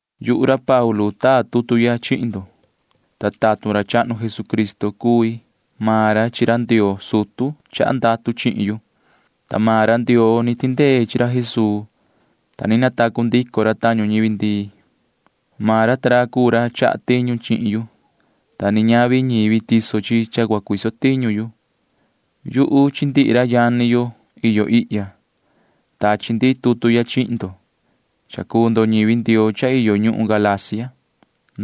Yuhu ra Paulu taa tutu ya chihin ndo, ta tatun ra Jesucristo cuu yuhu. Maan ra chi ra Ndioo sutu ra chaha ndatu chihin yu, ta ra Ndioo cuu ra tindee chi ra Jesuu, ta ni natacu ndico ra tañu ñivi ndii. Maan ra ta ra cuu ra chaha tiñu chi yuhu. Ñavi ñivi cuu ñi chaha tiñu chihin yu, ta ni ñavi ñivi cuu ñi sayaha tuhun ti cua cuise tiñu can. Yuhu chi ndihi ra yani yo iyo ihya―tachi ndi tutu ya chihi ndo, ta ñivi Ndioo iyo ñuhun Galacia cuu ndo.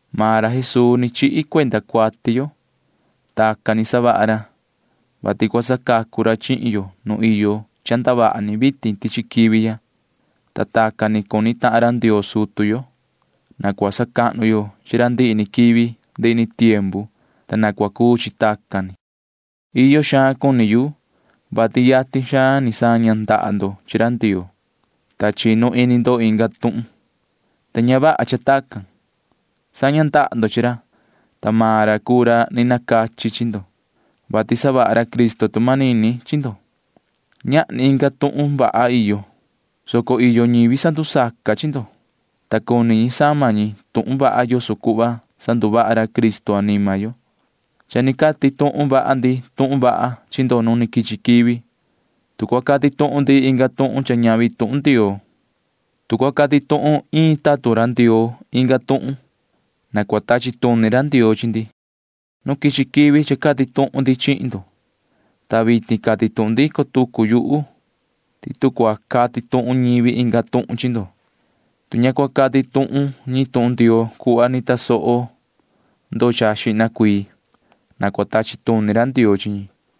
Maan ra Jesuu ni chihi cuenda cuati yo. Tacan ni savaha ra, vati cua sacacu ra chihin yo nu iyo ndavaha ni vitin tichi quivi ya, ta tacan ni cuni tahan ra Ndioo sutu yo. Na cua sacahnu yo chi ra ndihi ni quivi ndihi ni tiempu, ta na cua cuu chi tacan ni. Iyo xaan cuni yu, vati yatin xaan ni saña ndaha ndo chi ra Ndioo, ta chinu ini ndo inga tuhun, ta ña vaha cha tacan. Saña ndaha ndo chi ra, ta maan ra cuu ra ni nacachi chi ndo, vati savaha ra Cristo tu manini chi ndo. Ñahni inga tuhun vaha iyo, soco iyo ñivi sandusaca chi ndo, ta cuni ñi sama ñi tuhun vaha yoso cuhva sanduvaha ra Cristo anima yo. Cha ni cati tuhun vaha ndi tuhun vaha chi ndo nu quichi quivi. Tu cua cati tuhun maan ndi inga tuhun cha ñavi tuhun Ndioo, tu cua cati tuhun iin tatun Ndioo inga tuhun, na cua tachi tuni ra Ndioo chi ndi. Nu quichi quivi cha cati tuhun ndi chihin ndo, ta vitin cati tuhun ndico tucu yuhu ti tu cua cati tuhun ñivi inga tuhun chi ndo, tu ña cua cati tuhun ñi tuhun Ndioo cuhva ni tasoho xihna ndo, na cua tachi tuni ra Ndioo chi ñi.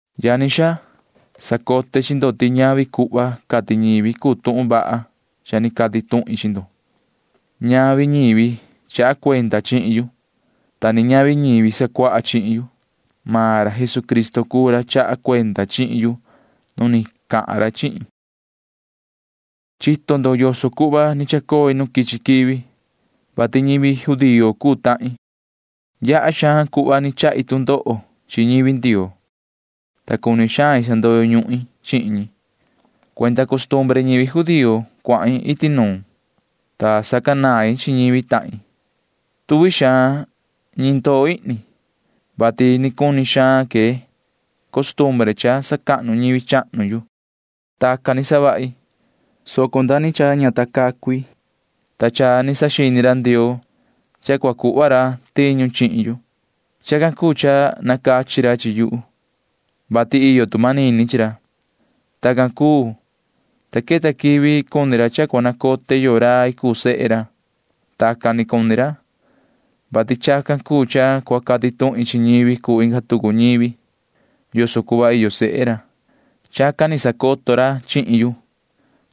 Yani xaa, sacote chi ndo ti ñavi cuhva cati ñivi cuu tuhun vaha cha ni cati tuhin chi ndo. Ñavi ñivi chaha cuenda chihin yu, ta ni ñavi ñivi sacuaha chihin yu. Maan ra Jesucristo cuu ra chaha cuenda chihin yu nu ni cahan ra chihin yu. Chito ndo yoso cuhva ni chacoi nu quichi quivi, vati ñivi judío cuu tahin. Yaha xaan cuhva cha ni chahi tu ndoho chi ñivi Ndioo, ta cuni xain sandoyo ñuhin chi ñi. Cuenda costumbre ñivi judío cuahin iti nuun, ta sacanain chi ñivi tahin. Tuvi xaan ñi ndoo ihni, vati cuni xaan que costumbre sacahnu ñivi ndi tiempu chahnu. Tacan ni cha ni savahi, soco nda ni cha ña ta cacu i, ta cha ni saxini ra Ndioo cha cua cuhva ra tiñu chihin yu. Chacan cuu cha nacachi ra chihin yu, vati iyo tu manini chi ra. Tacan cuu, ta queta quivi cuni ra cha cua nacote yoo rai cuu sehe ra. Tacan cuni ra, vati chacan cuu cha cua cati tuhin chi ñivi cuu inga tucu ñivi yoso cuhva iyo sehe ra. Chacan ni sacoto ra chihin yu,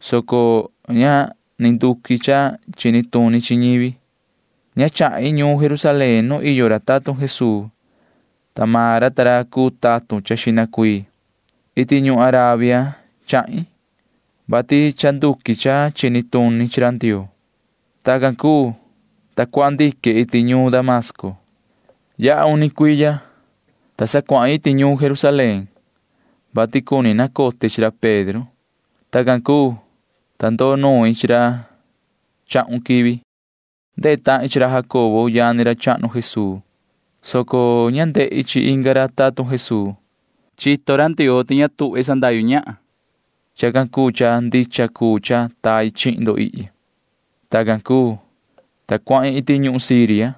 soco ña ni nduqui cha chini tuni chi ñivi. Ña chahin ñuun Jerusalén nu iyo ra tatun Jesuu, ta xihna ca maan ra cuu tatun ra. Iti ñuhun Arabia chahin, [vati cha nduqui cha chini tuni chi ra Ndioo]. Tacan cuu, ta cuahan ndique iti ñuun Damasco. Yaha uni cuiya, ta sa cuahin iti ñuun Jerusalén, vati cuni nacote chi ra Pedro. Tacan cuu, ta ndoo nuin chi ra chahun quivi. Ndehe tahin chi ra Jacobo yani ra chahnu Jesuu, soco ña ndehi chi inga ra tatun Jesuu. Chito ra Ndioo ti ña tuhva main sandahyu ñahan. Chacan cuu cha ndicha cuu cha tai chihin ndo ihya. Tacan cuu, ta cuahin iti ñuhun Siria,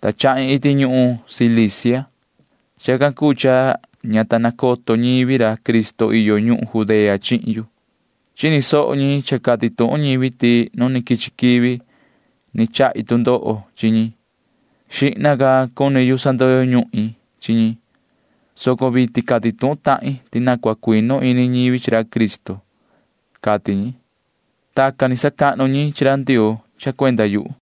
ta chahin iti ñuhun Cilicia. Chacan cuu cha ña ta nacoto ñivi Cristo iyo ñuhun Judea chihin yu. Chini soho ni ñi cha cati ñivi ti nu ni quichi quivi chahi tu ndoho chi ñi. Xihna ca cuni yu sandoyo ñuhin chi ñi, soco vitin cati tuhun tahin ti na cuinu ini ñivi chi ra Cristo, cati ñi. Tacan ni sacahnu ñi chi ra Ndioo cha cuenda yuhu.